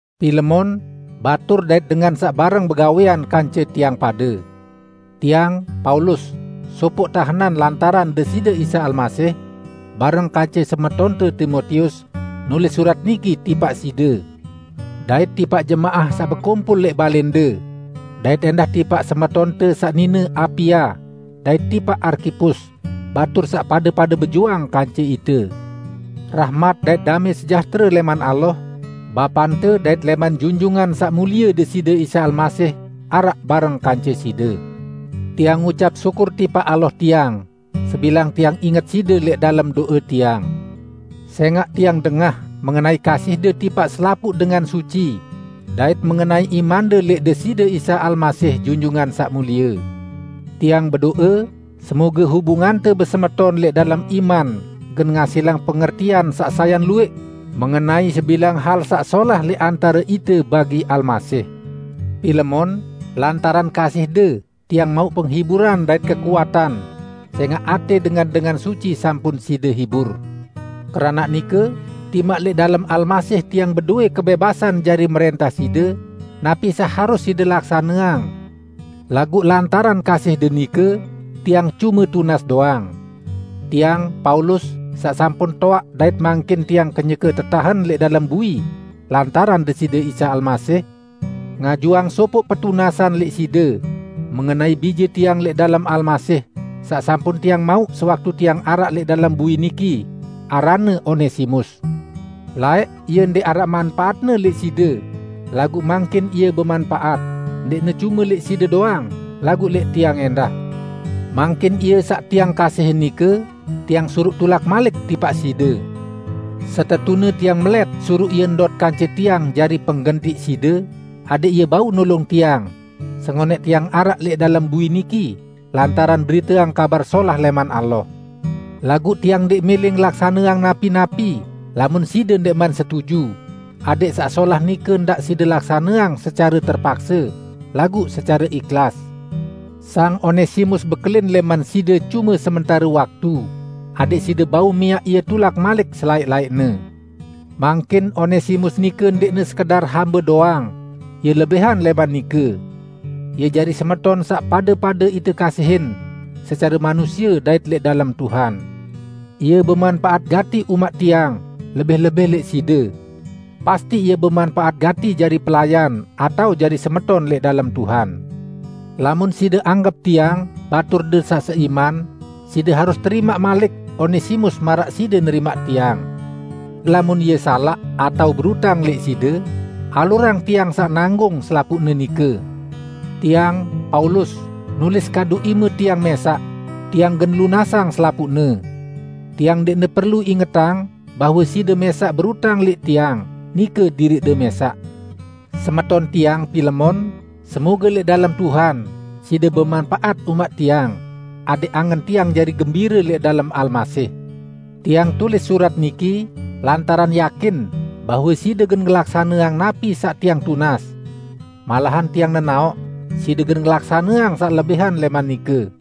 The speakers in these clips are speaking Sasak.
Pilemon, batur dait dengan saq bareng begawẽan kance tiang pade! Tiang, Paulus, sopoq tahenan lantaran Deside Isa Almasih, bareng kance semetonte Timotius, nulis surat niki tipaq side, dait tipaq jemaah saq bekumpul lẽq balẽnde; dait ẽndah tipaq semetonte saq nine Apia, dait tipaq Arkipus, batur saq pade-pade bejuang kance ite. Rahmat dait damẽ sejahtere lẽman Allah, Bapante dait lẽman Junjungan Saq Mulie Deside Isa Almasih araq bareng kance side. Tiang ngucap syukur tipaq Allah tiang, sebilang tiang inget side lẽq dalem do'e tiang. Sẽngaq tiang dengah mengenai kasihde tipaq selapuq dengan suci dait mengenai imande lẽq Deside Isa Almasih Junjungan Saq Mulie. Tiang bedo'e semoge hubungante besemeton lẽq dalem iman gen ngasilang pengertian saq sayan luwẽq mengenai sebilang hal saq solah lẽq antare ite bagi Almasih. Pilemon, lantaran kasihde, tiang mauq penghiburan dait kekuatan sẽngaq atẽ dengan-dengan suci sampun side hibur. Keranaq nike, timaq lẽq dalem Almasih tiang bedowẽ kebẽbasan jari mrẽntah side napi saq harus side laksaneang, laguq lantaran kasihde nike, tiang cume tunas doang. Tiang, Paulus, saq sampun toaq dait mangkin tiang kenyeke tetahen lẽq dalem bui lantaran Deside Isa Almasih, ngajuang sopoq petunasan lẽq side mengenai bije tiang lẽq dalem Almasih saq sampun tiang mauq sewaktu tiang araq lẽq dalem bui niki, aranne Onesimus. Laẽq ie ndẽq araq manpaatne lẽq side, laguq mangkin ie bemanpaat, ndẽqne cume lẽq side doang, laguq lẽq tiang ẽndah. Mangkin ie saq tiang kasihin nike tiang suruq tulak malik tipaq side. Setetune tiang melẽt suruq ie ndot kance tiang jari penggentiq side, adẽq ie bau nulung tiang, sengonẽq tiang araq lẽq dalem bui niki lantaran beriteang Kabar Solah lẽman Allah. Laguq tiang ndẽq mẽlẽ ngelaksaneang napi-napi lamun side ndẽqman setuju, adẽq saq solah nike ndaq side laksaneang secare terpakse, laguq secare ihlas. Sang Onesimus bekelin lẽman side cume sementare waktu, adẽq side bau miaq ie tulak malik selaẽq-laẽqne. Mangkin Onesimus nike ndẽqne sekedar hambe doang, ie lebihan lẽman nike. Ie jari semeton saq pade-pade ite kasihin, secare manusie dait lẽq dalem Tuhan. Ie bemanpaat gati umaq tiang, lebih-lebih lẽq side! Pasti ie bemanpaat gati jari pelayan atao jari semeton lẽq dalem Tuhan! Lamun side anggep tiang baturde saq seiman, side harus terimaq malik Onesimus maraq side nerimaq tiang. Lamun ie salaq atao berutang lẽq side, alurang tiang saq nanggung selapuqne nike. Tiang, Paulus, nulis kadu ime tiang mẽsaq: lunasang selapuqne. Tiang ndẽqne perlu ingetang bahwe side mẽsaq berutang lẽq tiang, nike diriqde mẽsaq. Semeton tiang Pilemon, semoge lẽq dalem Tuhan side bemanpaat umaq tiang, adẽq angen tiang jari gembire lẽq dalem Almasih. Tiang tulis surat niki lantaran yakin bahwe side gen ngelaksaneang napi saq tiang tunas. Malahan tiang nenaoq side gen ngelaksaneang saq lebihan lẽman nike.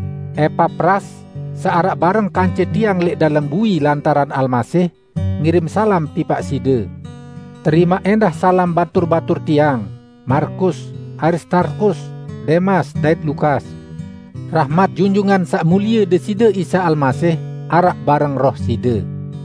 Epapras, saq araq bareng kance tiang lẽq dalem bui lantaran Almasih, ngirim salam tipaq side. Terimaq ẽndah salam batur-batur tiang: Markus, Aristarkus, Demas dait Lukas. Rahmat Junjungan Saq Mulie Deside Isa Almasih araq bareng roh side.